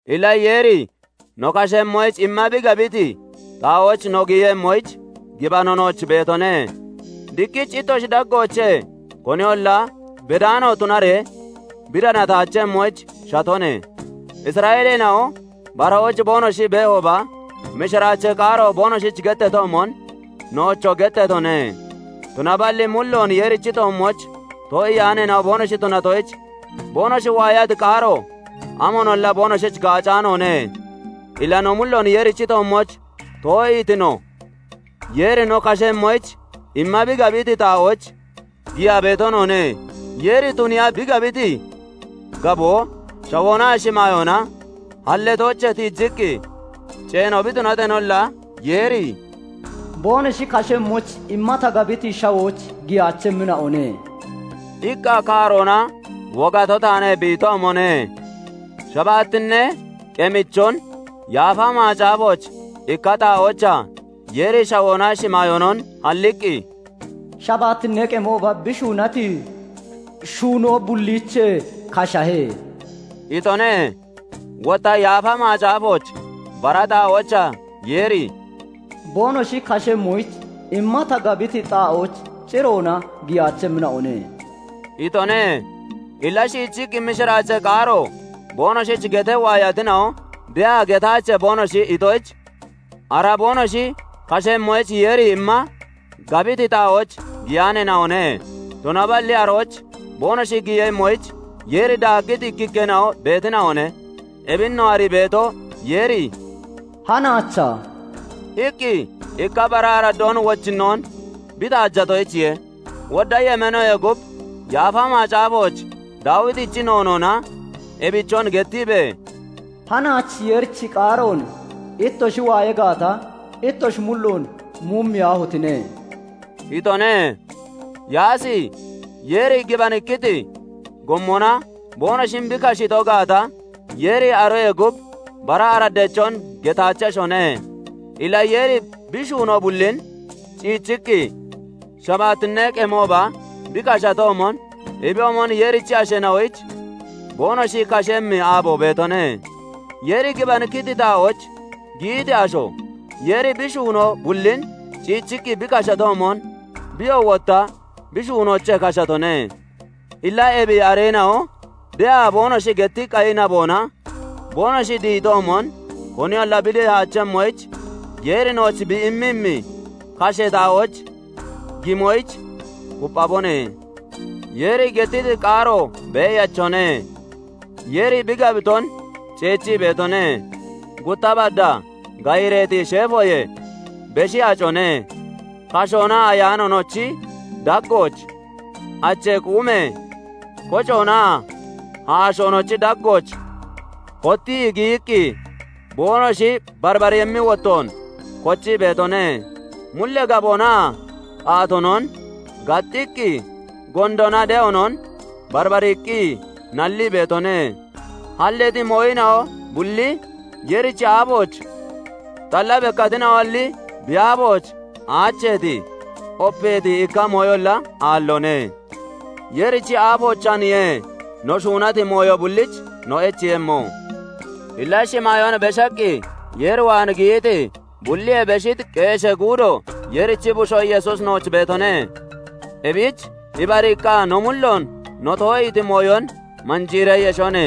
Illa Yeeri no kashemmoyich imma bi gabiti xaa'ooch no giyemmoyich gibano nooch beetone; diqqich ittoshi daggoochee koniyolla bedaano tunaree bi danataachemmoyich shatone. Isra'eeleena'o barahooch boonoshi beehooba mishiraachee qaaro boonoshich getteetoomon, noochoo getteetone; tunaballi mulloon Yeerichi toommooch too'iyaaneena'o boonoshi tunatoyich, boonoshi waayati qaaro amoonolla boonoshich gaacaanoone. Illa no mulloon Yeerichi toommooch too'iiti no, Yeeri no kashemmoyich imma bi gabiti xaa'ooch giyaa beeto noone. Yeeri tuniiya bi gabiti gaboo shawoonaa shimaayoona halleetoochee tiijiqqi ceeno bi tunateenolla, Yeeri "'Boonoshi kashemmoyich imma ta gabiti shawooch giyaachemmina'one" iqqa kaaroona wogato taane bi itoomone. Shabaattinnee qemichon Yaafa Macaafooch ikka xaa'oochaa Yeeri shawoonaa shimaayoonon halliqqi, shabaattinnee qemooba bi shuunati shuunoo bulliichee kashahe" itone. Wotta Yaafa Macaafooch bara xaa'oochaa Yeeri "Boonoshi kashemmoyich imma ta gabiti xaa'ooch ciroona giyaachemmina'one" itone. Illa shiichiqqi mishiraachee qaaro boonoshich getee waayatina'o de'a getaache boonoshi itoyich, ara boonoshi kashemmoyich Yeeri imma gabiti xaa'ooch giyaaneena'one; tunaballi arooch boonoshi giyemmoyich Yeeri daaggiti ikkikkeena'o beetina'one. Ebin no arii beeto, Yeeri "Hanaacha" iqqi ikka bara araddoon wochinnoon bi taajatoyichiye. Wodda yemeenoyee gub Yaafa Macaafooch Daawitichi noonoona ebichon gettiibee, "Hanaach Yeerichi qaaroon ittoshi waaya gaata, ittoshi mulloon muumiyaahotine!" itone. Yaasi Yeeri gibanikkiti gommona boonoshin bi kashiito gaata, Yeeri aroyee gub bara araddeechon getaacheshone. Illa Yeeri bi shuunoo bullin ciichiqqi, shabaattinnee qemooba bi kashatoomon, ebiyoomon Yeerichi asheena'oyich boonoshi kashemmi aabo beetone. Yeeri gibanikkiti xaa'ooch giyiti asho, Yeeri bi shuunoo bullin ciichiqqi bi kashatoomon, biyoo wotta bi shuunoochee kashatone. Illa ebi areena'o de'a boonoshi getti qayi naboona boonoshi dihitoomon koniyolla bi dihaachemmoyich, Yeeri nooch bi immemmi kashee xaa'ooch gimoyich kupphabone. Yeeri gettiti qaaro beeyachone; Yeeri bi gabiton ceechii beetone; gutta baddaa gayireeti sheefoyee beshi acone; kashoonaa ayaanoonochi daggooch, achee quumee kocoonaa haashoonochi daggooch hottii giyiqqi, boonoshi barbarimmi wotton kochii beetone; mullee gaboonaa qaatoonon gaxxiqqi gondoonaa de'oonon barbariiqqi nallii beetone. Halleeti mooyina'o bulli Yeerichi aafooch xalla bekkatina'oalli, bi aafooch aacheeti, opeeti ikka mooyolla aalloone; Yeerichi aafoochaaniye no shuunati mooyo bullich no echeeyemmo. Illa shimaayoon beshaqqi Yeer waan giyiti, bulliyee beshiti qeeshee guudo, Yeerichi Bushoo Yesuusi nooch beetone. Ebich ibariiqqa no mulloon no too'iiti mooyon manjiiree yeshone.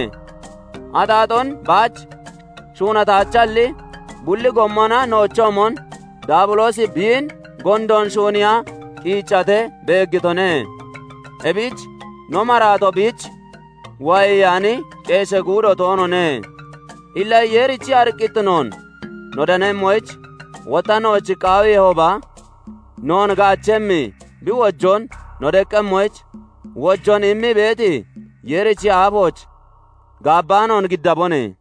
Axaaxoon baach shuunataachalli, bulli gommona noochoomon Daabiloosi biin gondoon shuuniiya qiiccatee beeggitone; ebich no maraato biich waayeyaani, qeeshee guudo toonoone. Illa Yeerichi ariqqittinoon no danemmoyich, wotta nooch qaawiihooba, noon gaachemmi bi wojoon no deqqemmoyich, wojoon immii beeti Yeerichi aafooch gaabbaanoon giddabone.